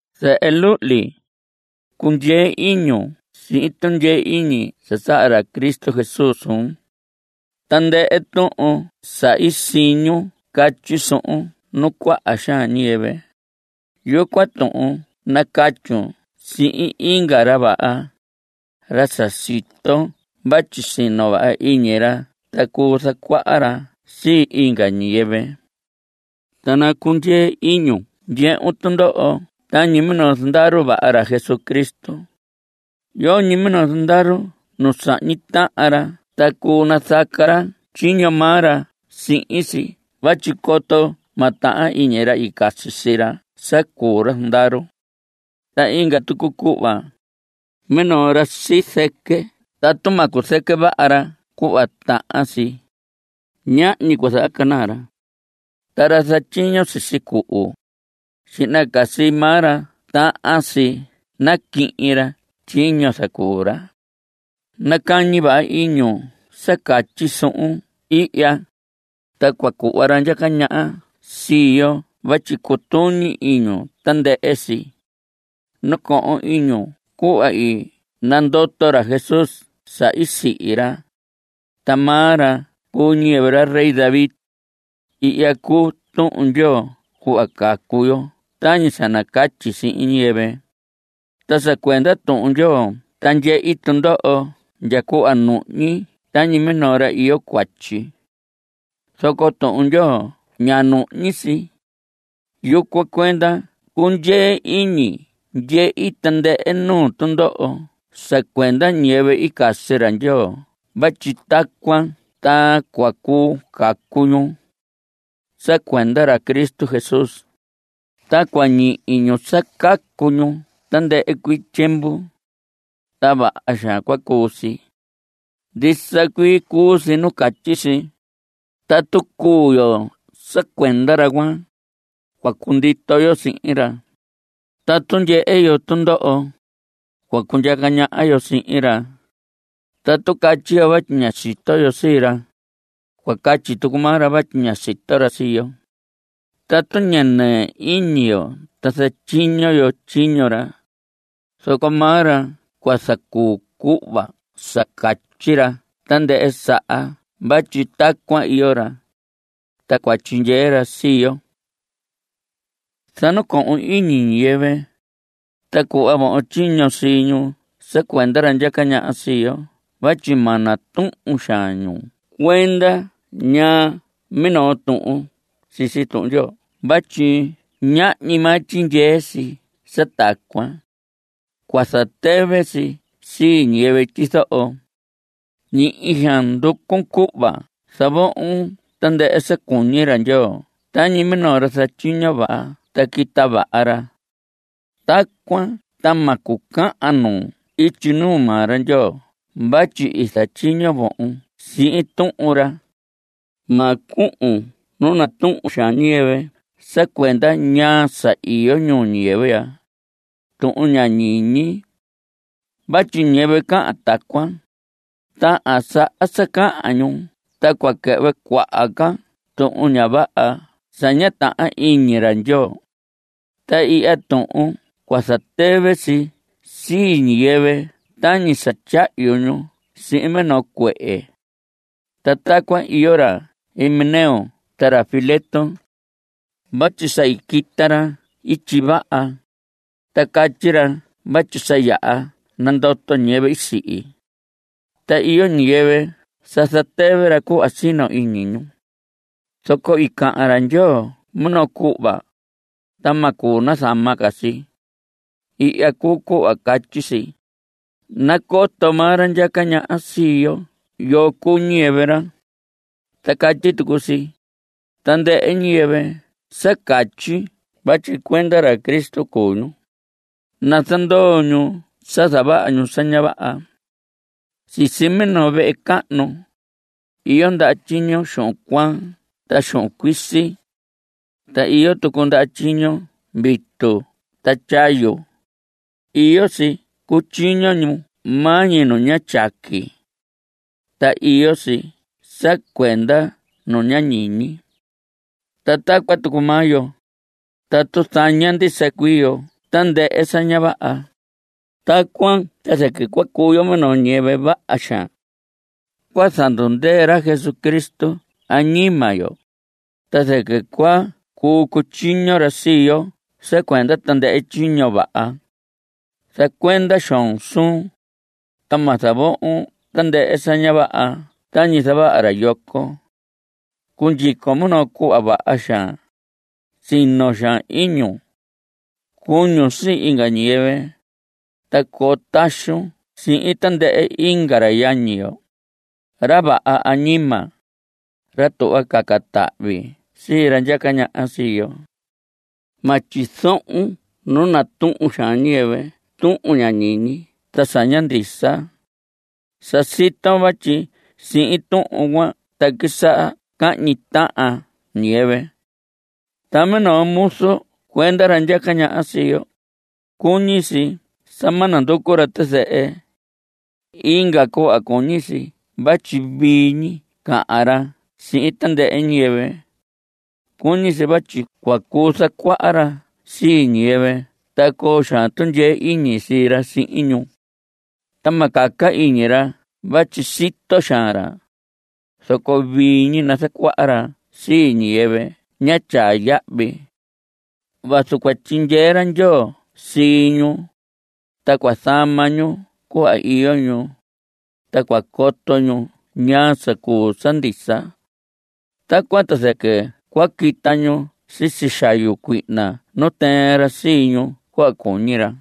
Zehe luhli, cundyee iñun sihin tundyee iñi sa saha ra Cristo Jesús suun. Tandɨhɨ tuhun sa i siñun catyi suhun nuu cuaha xaan ñiyɨvɨ, yucuan tuhun nacatyun sihin inga ra vaha, ra sa siton vatyi sino vaha iñi ra ta cuu zacuaha ra sii inga ñiyɨvɨ. Ta nacundyee iñun ndyehun tundoho tañi minoo zandaru vaha ra Jesucristo. Yoñi minoo zandaru nu sahñi tahan ra ta cuu nazaca ra tyiño maa ra sihin si vatyi coto ma tahan iñi ra i casi sii ra sa cuu ra zandaru. Ta inga tucu cuhva, minoo ra sizɨquɨ tatu ma cuzɨquɨ vaha ra cuhva tahan si, ñahñi cua zahacanaa ra. Ta ra zatyiño sisi cuhu, xihna ca sii maa ra tahan si naquihin ra tyiño i zacuu ra. Nacañi vaha iñun sa catyi suhun ihya, ta cua cuhva ra ndyaca ñaha sii yo vatyi cutuñi iñun tandɨhɨ si. Nacohon iñun cuhva i nandoto ra Jesús sa i sihi ra. Ta maa ra cuu ñiyɨvɨ ra rey David. Ihya cuu Tuhun Ndyoo cuhva cacu yo tañi sa nacatyi sihin ñiyɨvɨ. Ta sa cuenda Tuhun Ndyoo ta ndyehi tundoho ndya cuhva nuhñi tañi minoo ra iyo cuatyi. Zoco Tuhun Ndyoo ña nuhñi si. Yucuan cuenda cundyee iñi ndyehi tandɨhɨ nuu tundoho sa cuenda ñiyɨvɨ i casi ra Ndyoo vatyi tacuan ta cua cuu cacu ñu. Sa cuenda ra Cristo Jesús, ta cua ñihi ñu sa cacu ñu tandɨhɨ cuii tyiemvu. Ta vaha xaan cua cuu si. Ndisa cuii cuu si nu catyi si: “Tatu cuu yo sa cuenda ra cuan, cua cundito yo sihin ra. Tatu ndyehe yo tundoho, cua cundyaca ñaha yo sihin ra. Tatu catyi yo vatyi ña sito yo sii ra, cua catyi tucu maa ra vatyi ña sito ra sii yo. Tatu ña nɨɨ iñi yo ta zatyiño yo tyiño ra, zoco maa ra cua zacuu cuhva sa catyi ra tandɨhɨ saha vatyi tacuan iyo ra.” (Ta cua tyindyee ra sii yo.) Zanacohon iñi ñiyɨvɨ, ta cuhvon tyiño sii ñu sa cuenda ra ndyaca ñaha sii yo vatyi ma natuhun xaan ñu cuenda ñaa minoo tuhun sisi Tuhun Ndyoo vatyi ñahñi maa tyindyee si sa tacuan. Cua zatɨvɨ si sii ñiyɨvɨ tyizoho. Ñihi xaan nducun cuhva zavohon tandɨhɨ sa cuñi ra Ndyoo tañi minoo ra zatyiño vaha ta quita vaha ra. Tacuan ta ma cucahan nuun ityi nuu maa ra Ndyoo vatyi i zatyiño vohon sihin Tuhun ra. Ma cuhun nu natuhun xaan ñiyɨvɨ sa cuenda ñaa sa iyo ñuu ñiyɨvɨ ya, tuhun ña ñiñi. Vatyi ñiyɨvɨ cahan tacuan, tahan saha sa cahan ñu ta cua quɨhvɨ cuaha ca tuhun ña vaha sa ña tahan iñi ra Ndyoo. Ta ihya tuhun cua zatɨvɨ si sii ñiyɨvɨ tañi sa tyahyu ñu sihin minoo cuehe. Ta tacuan iyo ra Himeneo ta ra Fileto. Vatyi sa i quita ra ityi vaha, ta catyi ra vatyi sa yaha nandoto ñiyɨvɨ i sihi. Ta iyo ñiyɨvɨ sa zatɨvɨ ra cuhva sino iñi ñu. Zoco i cahan ra Ndyoo minoo cuhva, ta ma cuu nazama ca si. Ihya cuu cuhva catyi si: “Nacoto maa ra ndyaca ñaha sii yo yoo cuu ñiyɨvɨ ra.” Ta catyi tucu si: “Tandɨhɨ ñiyɨvɨ sa catyi vatyi cuenda ra Cristo cuu ñu, nazandoo ñu sa zavaha ñu sa ña vaha.” Sisi minoo vehe cahnu, iyo ndaha tyiño xuhun cuaan ta xuhun cuisi. Ta iyo tucu ndaha tyiño vitu ta ndyahyu. Iyo si cutyiño ñu maa ñi nu tyaqui, ta iyo si sa cuenda nu ña ñiñi. Ta tacuan tucu maa yo, tatu zaña ndisa cuii yo tandɨhɨ sa ña vaha, tacuan ta zɨquɨ cua cuu yo minoo ñiyɨvɨ vaha xaan. Cua zandundɨɨ ra Jesucristo añima yo, ta zɨquɨ cua cuu cutyiño ra sii yo sa cuenda tandɨhɨ tyiño vaha. Zacuenda xoon suun, ta ma zavohon tandɨhɨ sa ña vaha tañi zavaha ra yoco. Cundyicon minoo cuhva vaha xaan. Sino xaan iñun. Cuñun sii inga ñiyɨvɨ. Ta coo taxun sihin tandɨhɨ inga ra yañi yo, ra vaha añima, ra tuhva caca tahvi sii ra ndyaca ñaha sii yo. Ma tyizohon nu natuhun xaan ñiyɨvɨ tuhun ña ñiñi ta sa ña ndisa. Sa siton vatyi sihin tuhun cuan ta quisaha cahñi tahan ñiyɨvɨ. Ta minoo muzu cuenda ra ndyaca ñaha sii yo, cuñi si sa ma nanducu ra tizɨhɨ. Inga cuhva cuñi si vatyi vii ñi cahan ra sihin tandɨhɨ ñiyɨvɨ. Cuñi si vatyi cua cuu zacuaha ra sii ñiyɨvɨ ta coo xaan tundyee iñi sii ra sihin ñu. Ta ma caca iñi ra vatyi sito xaan ra, zoco vii ñi nazacuaha ra sii ñiyɨvɨ ña tyaa yahvi. Vazu cua tyindyee ra Ndyoo sii ñu, ta cua zama ñu cuhva iyo ñu, ta cua coto ñu ñaa sa cuu sa ndisa. Tacuan ta zɨquɨ cua quita ñu sisi xayu cuihna nu i tɨɨn ra sii ñu cuhva cuñi ra.